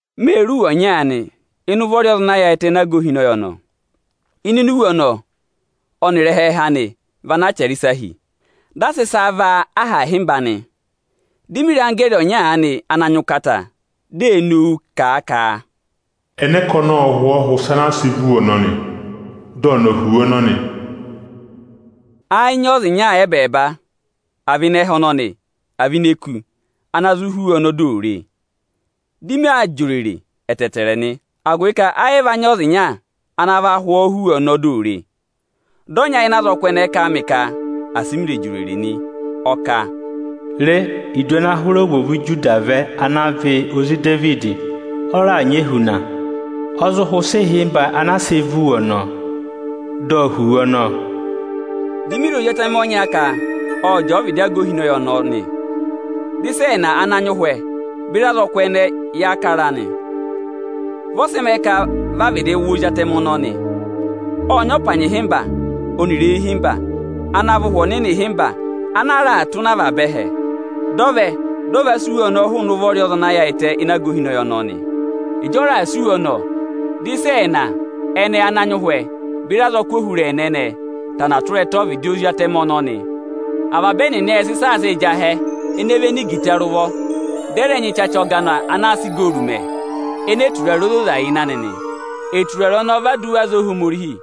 Mê re iwe ọnya ịnị ụvọ ọza ana yaayịtẹ ịnị aga ohinọyị ọnọọ. Ịnịnẹ iwe ọnọọ ọnịrị ẹhẹẹhẹ anị vị ana a chẹrẹ ịsa hi. Dị a sị ịsa vaa aha ịhịmba nị. Dị mị re anggẹẹrị ọnya aanị ana nyị ụkata, dị ee nowu kà a ka: Ẹnẹ ka ọnị ộ hụ ọọ hụ̀ ịsa ana a sị vá iwe ọnọnị, dị ọnị ọ̀ hụ̀ iwe ọnọnị? Ẹ yị nyị ọza ịnya ẹbẹẹba, à vị ịnị ẹhẹ ọnọnị, à vị ini eku, ana zụ hụ̀ iwe ọnọnị dị ò re e. Dị maa jị òrèrè ẹtẹẹtẹrẹ nị, agụvị ka ẹ yị va nyị ọza ịnya ana va hụ ọọ hụ̀ iwe ọnọọ dị ò re e. Dị ọnya ịnị azọkụ ẹnẹẹ kà a mị ka asị mị rẹ̀ jị òrèrè nị. Ọ kà, Re, Idu ana hụrẹ ovwoovu Ijuda vẹ, ana vị ozi Idevidi, ọ raà nyị ehuna. Ọ zụ hụ̀ ịsa ịhịmba ana a sị vá iwe ọnọọ, dị ọ hụ̀ iwe ọnọọ. Di mi re Ozi atẹmẹ ọnya ka ọ jẹẹ ọ́vịdị aga ohinọyị ọnọọ nị. Dị ịsa ẹẹna ana nyị ụhwẹ, beri azọkụ ẹnẹẹ jẹẹ jesi kara a nị. Vị ọ sị mẹẹ ka vị a vịdị wụ Ozi atẹmẹ ọnọọ nị. Ộ nyị ọpanyị ịhịmba ọnịrị eyi ịhịmba ana vị Ụhwẹ Ohomorihi ịhịmba ana a raà tụ́ nọ avaba ẹhẹ. Dị ọ vẹ, dị ọ va sị iwe ọnọọ hụụnị ụvọrị ọza ana yaayịtẹ ịnị aga ohinọyị ọnọọ nị. Ịjị ọ raà sị iwe ọnọọ, dị ịsa ẹẹna ẹnẹẹ ana nyị ụhwẹ, beri azọkụ ohurẹẹna ẹnẹẹ tana tụra ẹtẹ ọ́vịdị Ozi atẹmẹ ọnọọ nị. Avaba ẹnịnị ệ sị ịsa a sịị̄ jị ahẹ ene véné igita rị ụvọ, dị ẹ rẹ nyị ịchacha ọgana ana a sị igooru mẹ ene eturare ozoza yà ịnị anị nị. Eturare ọnọọ vị aduwa aza Ohomorihi.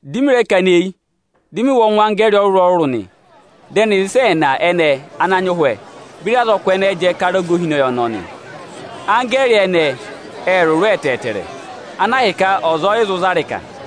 Dị mị rẹ kana eyi, dị mị wụ́ ọngwẹ anggẹẹrị ọrụrụ-ọrụrụ nị. Dị ẹnịrị ịsa ẹẹna ẹnẹẹ ana nyị ụhwẹ, beri azọkụ ẹnẹẹ jẹẹ kara aga ohinọyị ọnọọ nị. Anggẹẹrị ẹnẹẹ ẹ rụrụ ẹtẹẹtẹrẹ, ana ahịka ọza ọ yị zụ za ịrịka.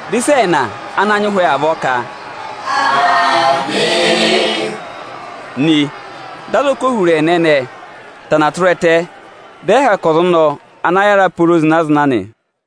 Dị ịsa ẹẹna ana nyị ụhwẹ avọọ ka Aamị nị. Dị azọkụ ohurẹẹna ẹnẹẹ tana tụra ẹtẹ, dị ẹ hẹkẹ ọza ọnọọ ana yára pooro zịna-zịna nị.